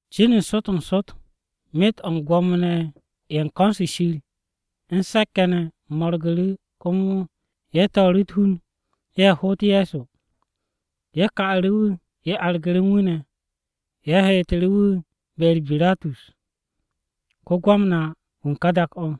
Cin n-sot n-sot, myet o̱ u̱n Gwo̱mo-ne̱ ye̱ u̱n ko̱n-se Shir u̱n se̱k-ye̱ ne̱ mo̱rgu̱ru̱ komo ye̱ to̱o̱ru̱ u̱t-hun ye̱ hoot Ye̱so. Ye̱ ka'u̱ru̱ wu̱, ye̱ argu̱ru̱ u̱n wu̱ ne̱, ye̱ heetu̱ru̱ wu̱ be-u̱r Biratus, ko-Gwamna-wu̱ u̱n ka dak-o.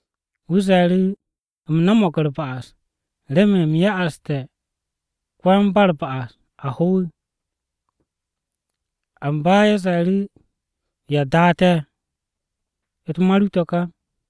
Wu̱ ze̱e̱ru̱, “U̱m no̱mo̱g u̱r-ba'as, remen u̱m ya'aste̱ ko-yan-ba-u̱r-ba'as a ho.” Amba ye̱ ze̱e̱ru̱, “¿Ya daa te̱? U̱t-ma ru to̱ ká.”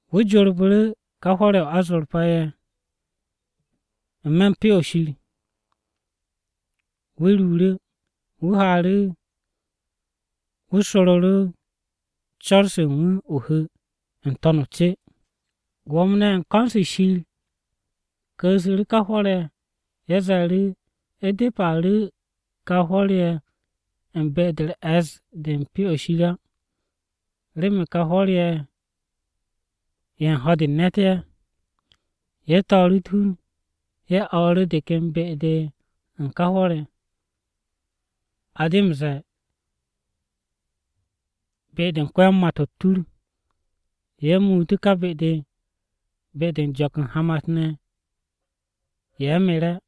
Wu̱ jorbu̱ru̱ ká hwo̱r-ye̱ o-azorpa ye̱ n-me̱ Pyo-o̱ Shir. Wu̱ ruuru̱, wu̱ haaru̱ wu̱ soru̱ru̱ cor-o̱ u̱n wu̱ o-hu̱ n-to̱n o-ce. Gwo̱mo-ne̱ ye̱ u̱n ko̱n-se Shir ye̱ ku̱u̱su̱ ká hwo̱r-ye̱, ye̱ ze̱e̱ru̱, “U̱depe̱ a ru̱ kà hwo̱r-ye̱ u̱n be-de u̱r-e̱ss de u̱n Pyo-o̱ Shir á, remen kà hwo̱r-ye̱ ye̱ u̱n ho̱-de u̱n ne̱t ye̱.” Ye̱ to̱o̱ru̱ u̱t-hun ye̱ o̱o̱ru̱ de ken be-de u̱n ká hwo̱r-ye̱. A de m-ze̱e̱ Be-de u̱n ko-yan-mà-to̱ u̱t-tur. Ye̱ muutu̱ ká be-de, be-de u̱n jo̱k u̱n hamat-ne̱ ye̱ mere̱.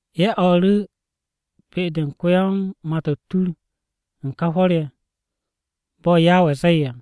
Ye̱ o̱o̱ru̱ be-de u̱n ko-yan-mà-to̱ u̱t-tur u̱n ká hwo̱r-ye̱, bo̱ Yawe zee à.”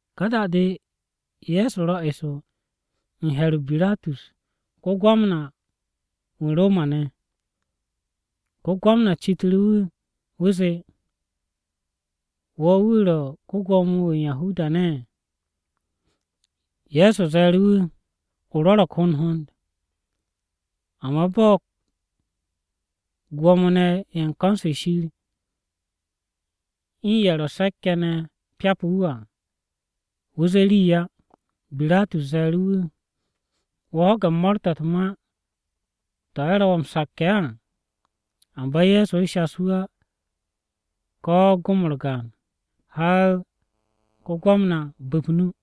Ka da-de, Ye̱so ro̱ eso u̱n he̱r-o Biratus ko-Gwamna-wu̱ u̱n Roma-ne̱. Ko-Gwamna citu̱ru̱ wu̱, wu̱ zee, “¿Wo̱ wu̱ ro̱ ko-Gwo̱mo-wu̱ u̱n Yahuda-ne̱?” Ye̱so ze̱e̱ru̱ wu̱, “O rwo̱ro̱g hond hond.” Amba bo̱ Gwo̱mo-ne̱ ye̱ u̱n ko̱n-se Shir u̱n ye̱ ro̱ se̱k-ye̱ ne̱ pyapu̱ wu̱ à, wu̱ zee ye̱ rii á. Biratus ze̱e̱ru̱ wu̱, “¿Wo̱ ho̱ge̱ mo̱o̱r-to̱ u̱t-ma to̱ ye̱ ro̱ wo̱ m-sakke̱ á?” Amba Ye̱so shas wu̱ ko̱ gom-u̱r gaan á, har ko-Gwamna bu̱p o-nu.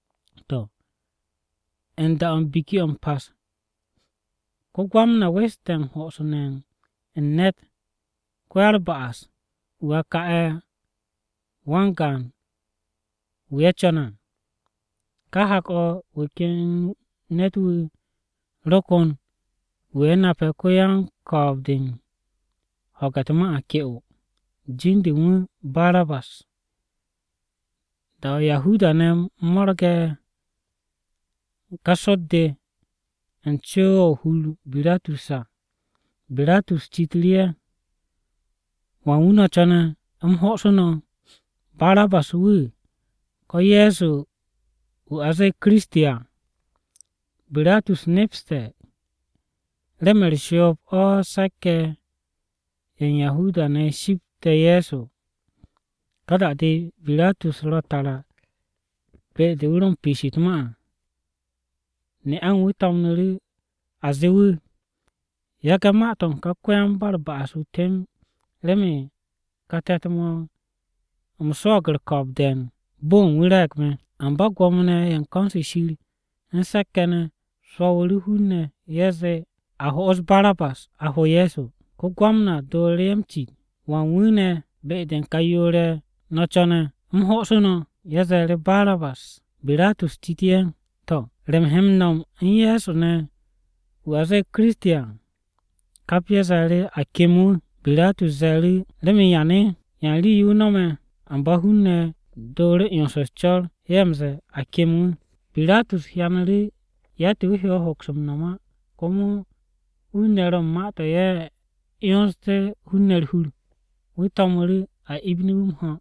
To̱, u̱n da-o̱ u̱n Biki-o̱ m-Pas, ko-Gwamna weste̱ u̱n hosu̱ne̱ u̱n ne̱t ko-ya-u̱r-ba'as-wu̱ a ka'e̱ wan-gaan wu̱ ye̱ co̱ne̱ à. Kà hak-o̱, wu̱ ken ne̱t-wu̱ ro ko̱n wu̱ ye̱ nape̱ ko-yan-ko̱o̱b-de u̱n ho̱ge̱ u̱t-ma ke'o, jin-de u̱n wu̱ Barabas. Da-o̱ Yahuda-ne̱ mo̱rge̱ ká sot-de u̱n co-o̱ hur-o Biratus à, Biratus citu̱ru̱ ye̱, “¿Wan wu̱ no̱ co̱ne̱ u̱m hosu̱ no̱? ¿Barabas wu̱ ko̱ Ye̱so wu̱ a zee Kiristi à?” (Biratus nepste̱ remen u̱r-shoob o̱ se̱k-ye̱ ye̱ u̱n Yahuda-ne̱ shipte̱ Ye̱so.) Ka da-de, Biratus ro tara be-de wu̱ ro piish u̱t-ma à, ne'a u̱n wu̱ to̱mnu̱ru̱ a zee wu̱, “Yage̱ ma-to̱ u̱n kà ko-yan-ba-u̱r-ba'as-wu̱ temb, remen kà te̱t-mo̱ u̱m swo̱o̱g u̱r-ko̱o̱b de̱e̱n, bo-o̱ u̱n wu̱ re̱e̱g me̱.” Amba Gwo̱mo-ne̱ ye̱ u̱n ko̱n-se Shir u̱n se̱k-ye̱ ne̱ swo̱wu̱ru̱ hun-ne̱ ye̱ zee a ho'os Barabas, a ho Ye̱so. Ko-Gwamna dooru̱ ye̱ m-cit, “¿Wan wu̱ ne̱ be-de u̱n kà yoor-ye̱ no̱ co̱ne̱ u̱m hoosu̱ no̱?” Ye̱ ze̱e̱ru̱, “Barabas!” Biratus citu̱ru̱ ye̱, “¿To̱, re u̱m he m-no̱m u̱n Ye̱so ne̱ wu̱ a zee Kiristi à?” Kap ye̱ ze̱e̱ru̱, “A kem wu̱!” Biratus ze̱e̱ru̱, “¿Remen yane̱? ¿Yan rii-yo wu̱ no̱me̱?” Amba hun-ne̱ dooru̱ 'yons u̱s-co̱r, ye̱ m-ze̱e̱, “A kem wu̱!” Biratus hyanu̱ru̱ yatt-yo wu̱ he hoks m-no̱m á, komo hun-ne̱ ro u̱n ma-to̱ ye̱ 'yonste̱ hun-ne̱ u̱r-hur. Wu̱ to̱mu̱ru̱ a ibinu̱ wu̱ m-ho̱.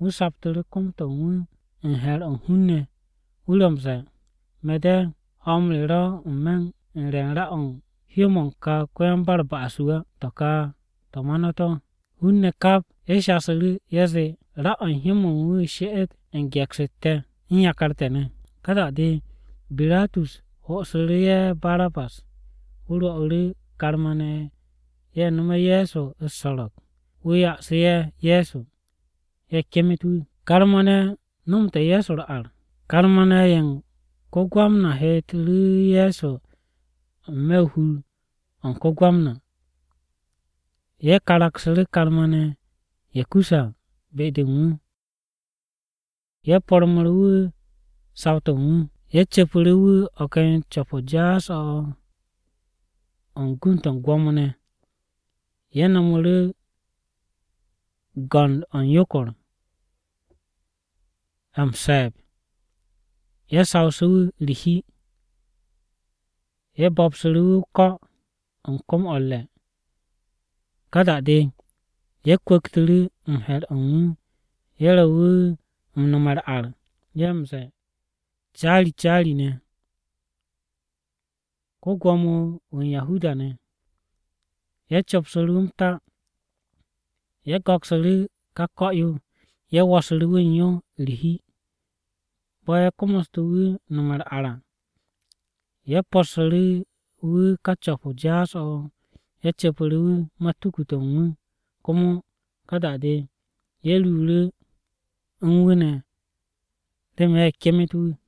Wu̱ saptu̱ru̱ kom-to̱ u̱n wu̱ u̱n he̱r-o̱ u̱n hun-ne̱. Wu̱ ro̱ m-ze̱e̱, “Me̱ de, ho̱-m re ro̱ n-me̱ u̱n re̱ u̱n ra-o̱ u̱n hyó-mo̱ u̱n kà ko-yan-ba-u̱r-ba'as-wu̱ á. To̱ kà ma-u̱t no̱ to̱.” Hun-ne̱ kap ye̱ shasu̱ru̱ ye̱ zee, “Ra-o̱ u̱n hyó-mo̱ u̱n wu̱ o̱ she'et u̱n ge̱ks-u̱t te̱, u̱n yakar te̱ ne̱!” Ka da-o̱ Biratus ho'osu̱ru̱ ye̱ Barabas. Wu̱ rwo̱'u̱ru̱ karma-ne̱ ye̱ nomse̱ Ye̱so u̱s-so̱ro̱g, wu̱ ya'asu̱ ye̱ Ye̱so, ye̱ kemet wu̱. Karma-ne̱ ye̱ u̱n ko-Gwamna heetu̱ru̱ Ye̱so n-me̱ u̱n hur-o̱ u̱n ko-Gwamna. Ye̱ karaksu̱ru̱ karma-ne̱ ye̱ kusse̱ à be-de u̱n wu̱, Ye̱ pormu̱ru̱ wu̱ saw-to̱ u̱n wu̱. Ye̱ cu̱pu̱ru̱ wu̱ o̱ ken co̱p-o jaas-o̱ o̱ u̱n go̱nd-to̱ u̱n gwo̱mo-ne̱. Ye̱ no̱mu̱ru̱ go̱nd-o̱ u̱n yokor-ye̱ m-se̱e̱b, ye̱ sawsu̱ wu̱ u̱r-hi. Ye̱ bo̱bsu̱ru̱ wu̱ o-ko̱ u̱n kom-o̱ u̱r-re̱. Ká da-de ye̱ kwu̱ktu̱ru̱ u̱n he̱r-o̱ u̱n wu̱, ye̱ ro̱ wu̱ u̱n nome̱ u̱r-ar. Ye̱ m-ze̱e̱, “Caari caari-ne̱, ko-Gwo̱mo-wu̱ u̱n Yahuda-ne̱!” Ye̱ copsu̱ru̱ wu̱ m-ta. Ye̱ go̱ksu̱ru̱ ká ko̱-yo, ye̱ wo̱su̱ru̱ wu̱ u̱n yo u̱r-hi. Bo̱ ye̱ komoste̱ wu̱ nome̱ u̱r-ar à, ye̱ possu̱ru̱ wu̱ ka co̱p-o jaas-o̱ o̱, ye̱ cu̱pu̱ru̱ wu̱ matuku-to̱ u̱n wu̱. Komo ka da-de ye̱ ruuru̱ u̱n wu̱ ne̱ remen ye̱ kemet wu̱.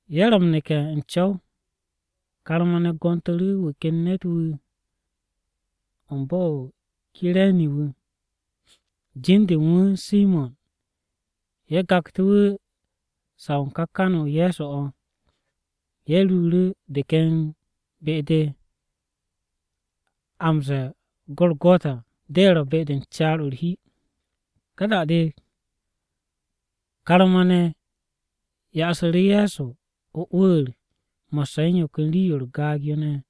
Ye̱ ro m-neke̱ n-co̱w, karma-ne̱ gontu̱ru̱ wu̱ ken ne̱t-wu̱ bo̱-o̱ o-Kire̱ni wu̱, jin-de u̱n wu̱ Simo̱n. Ye̱ gaktu̱ wu̱ saw u̱n ká kan-o Ye̱so o̱. Ye̱ ruuru̱ de ken be-de a m-ze̱e̱ o-Gorogota à, (de ro̱, Be-de u̱n caar-o̱ u̱r-hi). Ka da-de, karma-ne̱ ya'asu̱ru̱ Ye̱so m-mo̱di mo̱sse̱ u̱n yo ken rii-yo u̱r-gaag yo ne̱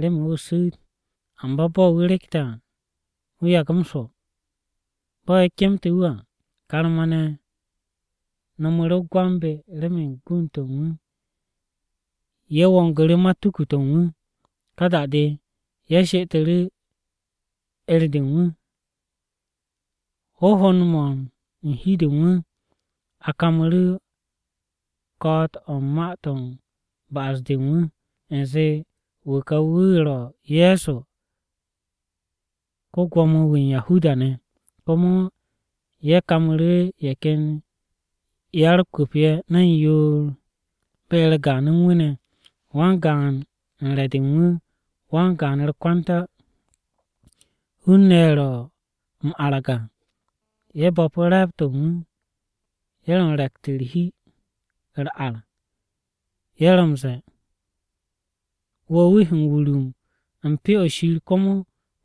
remen wu̱ su̱u̱t, amba bo̱ wu̱ rekte̱ à wu̱ yagu̱ m-swo̱. Bo̱ ye̱ kemtu̱ wu̱ à, karma-ne̱ no̱mu̱ru̱ o-gwambe̱ remen gund-to̱ u̱n wu̱. Ye̱ wongu̱ru̱ matuku-to̱ u̱n wu̱. Ka da-de, ye̱ she'etu̱ru̱ 'er-de u̱n wu̱. Hohond-mo̱ u̱n hi-de u̱n wu̱, a kamu̱ru̱ ko̱'o̱t-o̱ u̱n ma-to̱ u̱n ba'as-de u̱n wu̱. U̱nze, “Wu̱ kà wu̱ ro̱ Ye̱so ko-Gwo̱mo-wu̱ u̱n Yahuda-ne̱.” Komo ye̱ kamu̱ru̱ ye̱ ken ya-u̱r-kwu̱p ye̱ ne̱n yoor be-u̱r gaan u̱n wu̱ ne̱. Wan-gaan u̱n re̱-de u̱n wu̱, wan-gaan u̱r-kwanta. Hun-ne̱ ye̱ ro̱ m-arag à, ye̱ bo̱pu̱ re̱e̱b-to̱ u̱n wu̱. Ye̱ ro̱ u̱n re̱kt u̱t-hi u̱r-ar. Ye̱ ro̱ m-ze̱e̱, “Wo̱ wu̱ he m-wurum u̱n Pyo-o̱ Shir, komo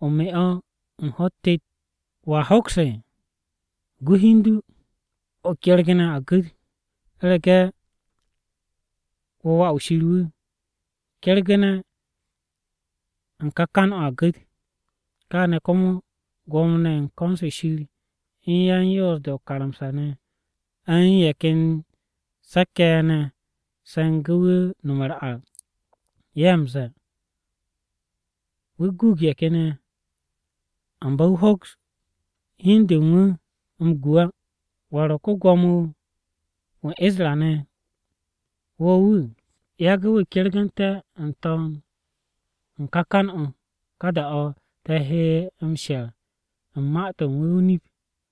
o me o̱ u̱n ho̱-u̱t tet. ¿Wo̱a hoks? Gu hi u̱n du, o kergu̱ne̱ a gu̱t! U̱rege̱ wo̱ Wà-wu̱ Shir wu̱, kergu̱ne̱ u̱n ká kan-o̱ a gu̱t!” Káane̱ komo Gwo̱mo-ne̱ ye̱ u̱n ko̱n-se Shir, u̱n yan-Yoos-de o-karamsa ne̱ u̱n ye̱ ken se̱k-ye̱ ne̱ ye̱ se̱ngu̱ wu̱ nome̱ u̱r-ar. Ye̱ m-ze̱e̱, “Wu̱ guug ye̱ ken ye̱, amba wu̱ hoks hi u̱n de u̱n wu̱ m-gu á! ¿Wu̱ ro̱ ko-Gwo̱mo-wu̱ u̱n Isra-ne̱, wu̱ wu̱? Yage̱ wu̱ kergu̱nte̱ n-to̱n u̱n ká kan-o̱, ká da-o̱ te̱ he m-she̱r u̱n ma-to̱ u̱n wu̱ o-nip.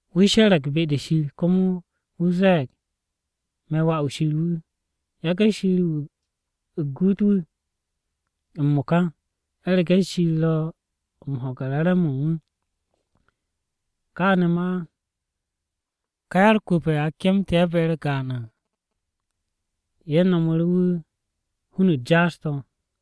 Wu̱ she̱re̱g be-de Shir, komo wu̱ ze̱e̱g, ‘Me̱ wà-wu̱ Shir wu̱.’” Yage̱ Shir wu̱ guut wu̱ m-mo̱ka! U̱rege̱ Shir ro̱ m-ho̱ge̱ re̱re̱m-mo̱ u̱n wu̱. Káane̱ ma ká ya-u̱r-kwu̱p ye̱ a kemtu̱ ye̱ be-u̱r gaan à, ye̱ nomu̱ru̱ wu̱ hun-u̱t jaas-to̱.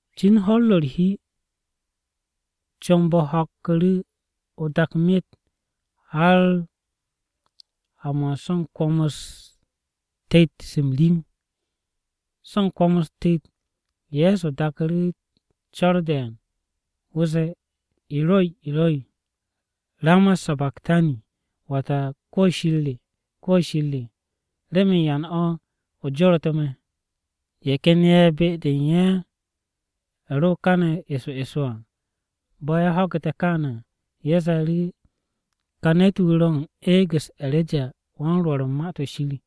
Cin ho̱-u̱r ro̱ u̱r-hi, comb-o ho̱kku̱ru̱ o-dak myet, har ha-mo̱ u̱n so̱ u̱n kwo̱m-u̱s tet-se m-rim. So u̱n kwo̱m-u̱s tet, Ye̱so daku̱ru̱ co̱r de̱e̱n. Wu̱ zee, “E̱roi, E̱roi, ¿rama sabaktani?” Wata “Kwo̱ Shir re, kwo̱ Shir re, ¿remen yan o̱ o joru̱tu̱ me̱?” Ye̱ ken ye̱ be-de u̱n ye̱ ro káne̱ eso eso à, bo̱ ye̱ ho̱gu̱te̱ káane̱ à, ye̱ ze̱e̱ru̱, “Kà ne̱t-wu̱ ro̱ u̱n eeg-u̱s E̱rejawan-Rwo̱r u̱n Ma-to̱ Shir.”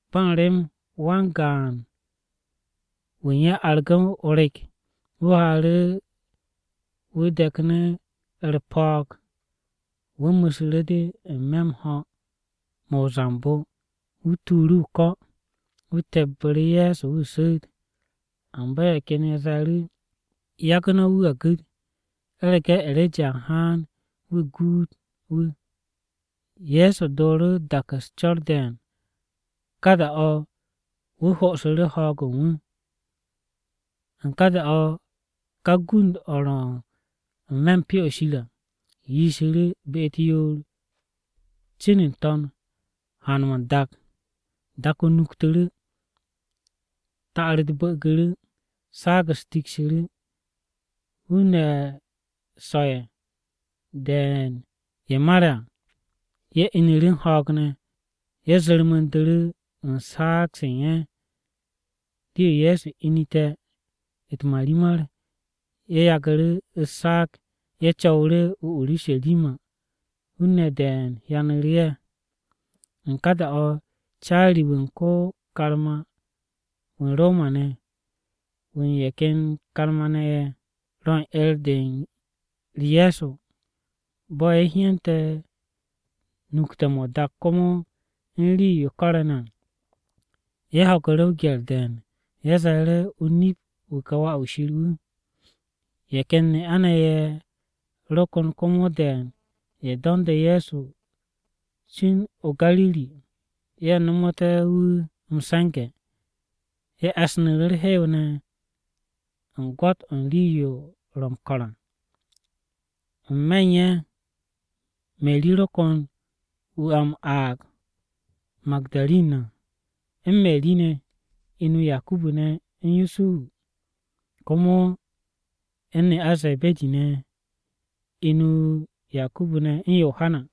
Ba m-rem wan-gaan wu̱ u̱n ye̱ argu̱ o-rek, wu̱ haaru̱ wu̱ de̱knu̱ u̱r-po̱o̱g. Wu̱ mu̱su̱ru̱ de n-me̱ u̱n ho̱-mo̱ o-zambo, wu̱ tuuru̱ o-ko̱. Wu̱ tebbu̱ru̱ Ye̱so wu̱ su̱u̱t. Amba ye̱ ken ye̱ ze̱e̱ru̱, “Yagu̱ no̱ wu̱ a gu̱t, u̱rege̱ E̱reja a haan wu̱ guut wu̱ à.” Ye̱so dooru̱ dak u̱s-co̱r de̱e̱n, ka da-o̱ wu̱ ho'osu̱ ho̱o̱g-o̱ u̱n wu̱. U̱n ká da-o̱, ká gund-o̱ ro n-me̱ u̱n Pyo-o̱ Shir à yishu̱ru̱ be-u̱t yoor, cin n-to̱n haan-mo̱ n-dak. Dak-o nuktu̱ru̱, ta'ar-u̱t bu̱'u̱gu̱ru̱. Saag-u̱s teksu̱ru̱, hun-ne̱ so̱-ye̱ de̱e̱n ye̱ mare̱ à ye̱ inu̱ru̱ u̱n ho̱o̱g ne̱. Ye̱ zu̱rmu̱ndu̱ru̱ u̱n saag-se u̱n ye̱. Rii Ye̱so inete̱ u̱t-marimar, ye̱ yagu̱ru̱ u̱s-saag, ye̱ co̱wu̱ru̱ o-Urusharima, hun-ne̱ de̱e̱n hyanu̱ru̱ ye̱. U̱n ká da-o̱, caari-wu̱ u̱n ko-karma-wu̱ u̱n Roma-ne̱, wu̱ u̱n ye̱ ken karma-ne̱ ye̱ ro u̱n 'er-u̱r Ye̱so à. Bo̱ ye̱ hyente̱ nukte̱-mo̱ o-dak komo u̱n rii-yo ko̱re̱ ne̱ à, ye̱ ho̱gu̱ru̱ o-gye̱r de̱e̱n. Ye̱ ze̱e̱ru̱, “O-nip, wu̱ ka Wà-wu̱ Shir wu̱!” Ye̱ ken ne'a-ne̱ ye̱ ro ko̱n komo de̱e̱n ye̱ do̱nde̱ Ye̱so cin o-Gariri, ye̱ nomote̱ wu̱ m-se̱nge̱. Ye̱ e̱snu̱ru̱ u̱r-hew ne̱ u̱n gwo̱t-o̱ u̱n rii-yo ro̱ m-ko̱r à. N-me̱ u̱n ye̱, Meri ro ko̱n wu̱ a m-aag Magu̱darin à, u̱n Meri ne̱ (inu Yakubu ne̱ u̱n Yusuhu), komo u̱n ne'a Ze̱be̱di (inu Yakubu u̱n Yohana).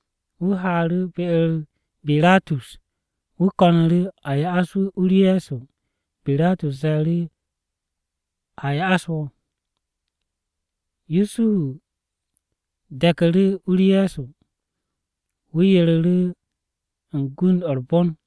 Wu̱ haaru̱ be-u̱r Biratus. Wu̱ ko̱nu̱ru̱ a ya'as wu̱ u-u̱r Ye̱so. Biratus ze̱e̱ru̱ a ya'as wu̱. Yusuhu de̱ku̱ru̱ u-u̱r Ye̱so, wu̱ yereru̱ u̱n gund-o u̱r-bon.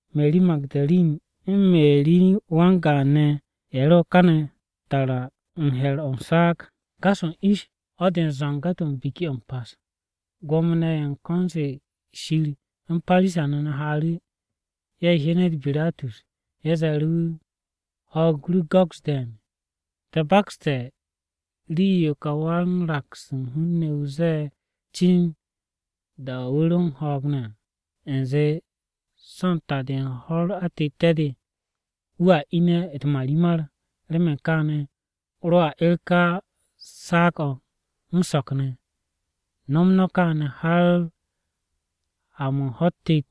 Meri Magu̱darin, u̱n Meri wan-gaan ne̱ ye̱ ro káne̱ tara u̱n he̱r-o̱ u̱n saag. Gas-o̱ u̱n ish, ho̱-de u̱n zo̱nge̱-to̱ u̱n Biki-o̱ m-Pas, Gwo̱mo-ne̱ ye̱ u̱n ko̱n-se Shir u̱n Parisa-ne̱ haaru̱, ye̱ hyenet Biratus. Ye̱ ze̱e̱ru̱ wu̱, “Ho̱o̱g ru go̱s de̱e̱n! Te̱ bakste̱ rii-yo ká wan-raks u̱n hun-ne̱ wu̱ zee cin da-o̱ wu̱ ro u̱n ho̱o̱g ne̱ à, u̱nze so̱ u̱n ta-de u̱n ho̱-u̱r atette̱-de, wu̱a ine̱ u̱t-marimar. Remen káane̱, rwo̱ a 'er ká saag-o̱ m-so̱k ne̱. No̱m no̱ kaane̱ har ha-mo̱ u̱n ho̱-u̱t tet,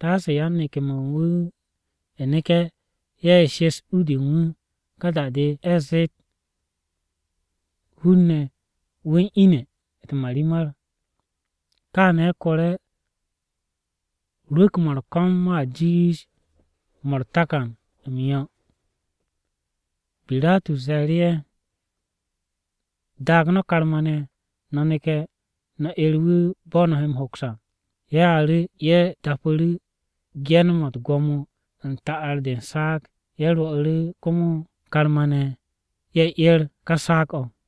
taase yan-neke̱-mo̱ u̱n wu̱ neke̱ ye̱ shes u-de u̱n wu̱, ká da-de ye̱ zeet hun-ne̱ wu̱ u̱n ine̱ u̱t-marimar. Káane̱ kore̱ rwu̱k-mo̱ u̱r-ko̱m mo̱a jiish mo̱ u̱r-takan m-yo̱.” Biratus ze̱e̱ru̱ ye̱, “Daag no̱ karma-ne̱, no̱ neke̱ no̱ 'er wu̱ bo̱ no̱ he m-hoks à.” Ye̱ haaru̱, ye̱ dapu̱ru̱ ge̱n-mo̱ u̱t-gwo̱mo u̱n ta'ar-de u̱n saag. Ye̱ rwo̱'u̱ru̱ komo karma-ne̱ ye̱ 'er ká saag-o̱.